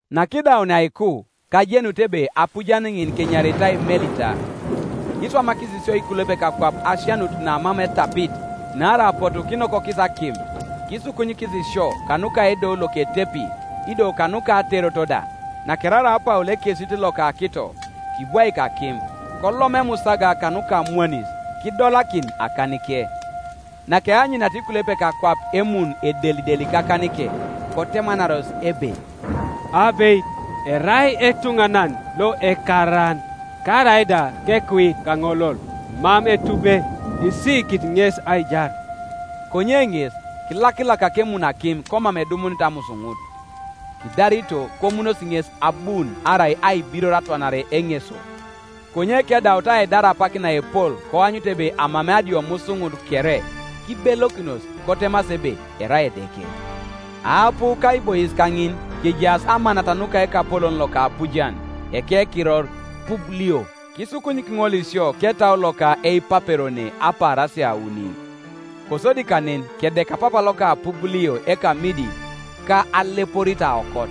Nakidaunia aiku, kajenut ebe apujan ŋin kenyaritai Melita. Kiswamakis sio ikulepek akwap asianut namam etapit, naarai apotu kinokokis akim, kisukunyikis sio, kanuka edou loketepi, ido kanuka aterot da. Nakeraraa Paul ekesit loka akito, kibwaik akim, kolom emusaga kanuka amwanis, kidolakin akanike. Nakeanyuniata ikulepek akwap emun edelideli kakanike, kotemanaros ebe, “Abeit erai etuŋanan lo ekaaran, Karaida kekuit kaŋolol, mam Etube isiikit ŋes aijar.” Konye ŋes kilakilakak emun akim komam edumunit amusuŋut. Kidarito, komunosi ŋes abuun arai aibiror atwanare eŋeso; konye kedaut aidar apak naepol koanyut ebe amamei adiomusuŋut kere, kibelokinos kotemasi ebe erai edeke. Aapu kaibois kaŋin kejaas amanat nuka ekapolon loka apujan, ekekiror Publio, kisukunyik ŋol sio ketau loka eipaperone apaarasia auni. Kosodi kanen kedeka papa loka Publio ekamidi ka aleporit aokot,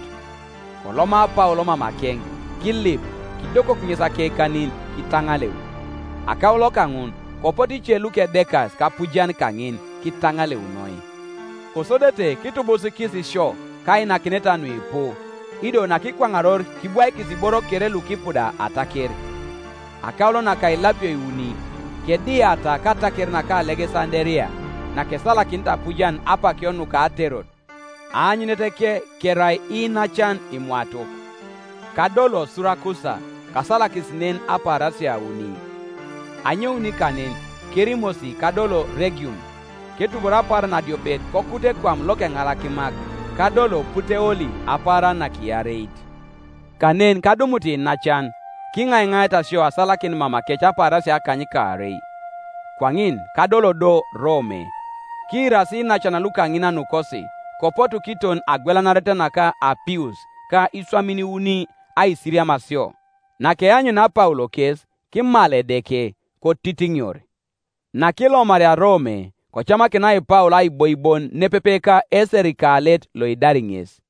koloma Paul mamakeŋ, kilip, kidokok ŋes akekanin, kitaŋaleu, Akaulo kaŋun, kopotu ice lukedekas kapujan kaŋin kitaŋaleunoi. Kosodete kitubusikis sio kainakineta nuipu; ido nakikwaŋaror kibwaikis iboro kere lukipuda ataker. Akaulo naka ilapio iuni, kediata kataker naka Alegesanderia, nakesalakinit apujan apakio nuka aterot, aanyuneteke kerai Iinacan Imwatok, Kadolo Surakusa, kasalakis nen apaarasia auni. Anyoun kanen kerimosi kadolo Regium; ketubor apaaran adiopet kokut ekwam lokeŋalakimak, kadolo Puteoli apaaran nakiareit. Kanen kadumut iinacan, kiŋaiŋaata sio asalakin mamakec apaarasia akanykaarei. Kwaŋin kadolo do Rome. Kiirasi iinacan lukaŋina nukosi, kopotu kiton Agwelanaret naka Apius ka Iswamin Iuni aisiriam sio. Nakeanyunia Paul kes, kimal Edeke, kotitiŋior. Nakilomaria Rome, kocamakinai Paul aiboi bon nepepe ka eserikalet loidari ŋes.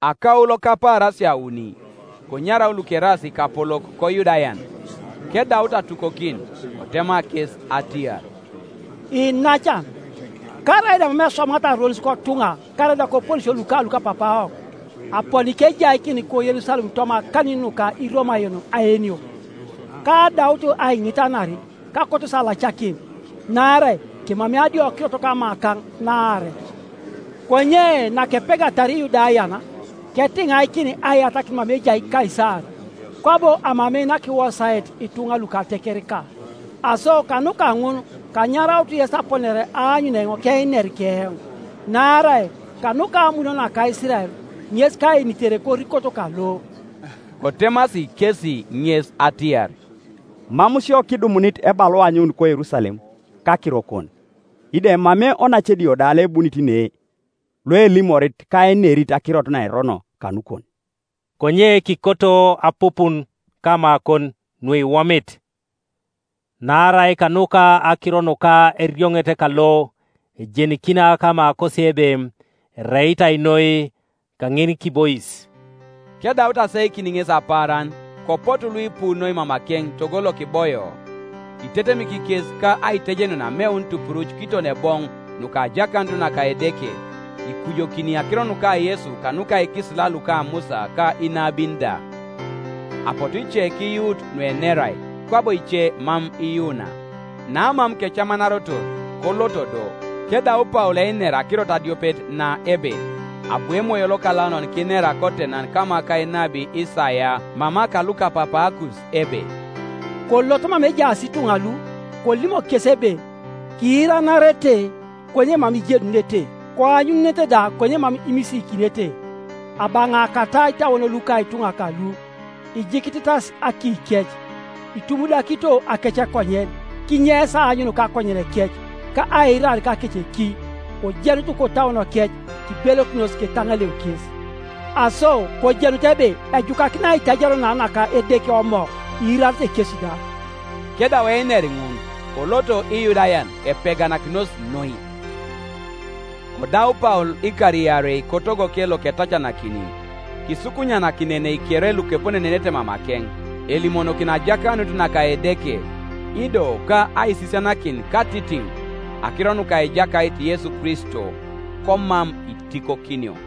Akaulo kapaarasia auni konyarau lukeraas ikapolok koYudayan; kedaut atukokin, kotema kes atiar, “Iinacan, karaida mam eswamat aronis kotuŋa karaida koponesio luka lukapapaawok, aponi kejaikin ko Yerusalem toma akanin nuka Iromayon aenio. Kaadaut aiŋitanar, kakotosi alacakin, naarai kemamei adiokirot kamakaŋ naaret. Konye nakepegatar Iyudayan, ketiŋaikin aiyatakin mama ejai Kaisar-kwabo amamei nakiwosaet ituŋa luka atekereka. Aso kanuka ŋun kanyarautu yes aponare aanyun eoŋ keiner keoŋ, naarai kanuka amun naka Isirael ŋes kaenitere korikot kalo.” Kotemasi kesi ŋes atiar, “Mam sio kidumunit ebalua anyoun koYerusalem kakirokon, ido emamei onace edio da loebunit ne loelimorit ka ainerit akirot naerono kanukon. Konye kikoto apupun kamakon nuiwomit; naarai kanuka akiro nuka erioŋet kalo ejenikina kamakosi ebe ereitai noi kaŋinikibois.” Kedaut aseikin ŋes apaaran kopotu luipu noi mamakeŋ togo lokiboio. Kitetemik kes ka aitejenun ameun tupuruc kiton eboŋ nuka ajakanut naka Edeke, ikujokini akiro nuka Yesu kanuka ikisila luka Musa ka inabin da. Apotu ice kiyuut nuenerai, kwabo ice mam iyuuna. Namam kecamanarotor, koloto do, kedau Paul einer akirot adiopet na ebe: “Abu Emoyo Lokalaunan kinera kotenan kama ka enabi Isaia mama ka lukapapaakus ebe: ‘Kolot mama ejaas ituŋa lu, kolimok kes ebe: Kiiranarete konye mam ijenunete, Koanyuŋunete da konye mam imisiikinete, Abaŋaakata itauon luka ituŋa kalu, Ijikititas akiikec, Itumudakito akecekonyen, Kinyeis aanyun kakonyenekec, Ka aiirar kakeceki, Kojenut kotauonokec, Kibelokinos ketaŋaleu kes.’ Aso kojenutu ebe ejukakin aitajario na naka Edeke Omo: iirarete kesi da.” [ Kedau einer ŋun koloto Iyudayan, epeganakinos noi.] Kodau Paul ikar iarei kotogoke loketacanakini, kisukunyanakinenei kere lukeponenenete mamakeŋ, elimonokini ajakanut naka Edeke, ido ka aisisianakin katitiŋ akiro nuka Ejakait Yesu Kristo, komam itikokinio.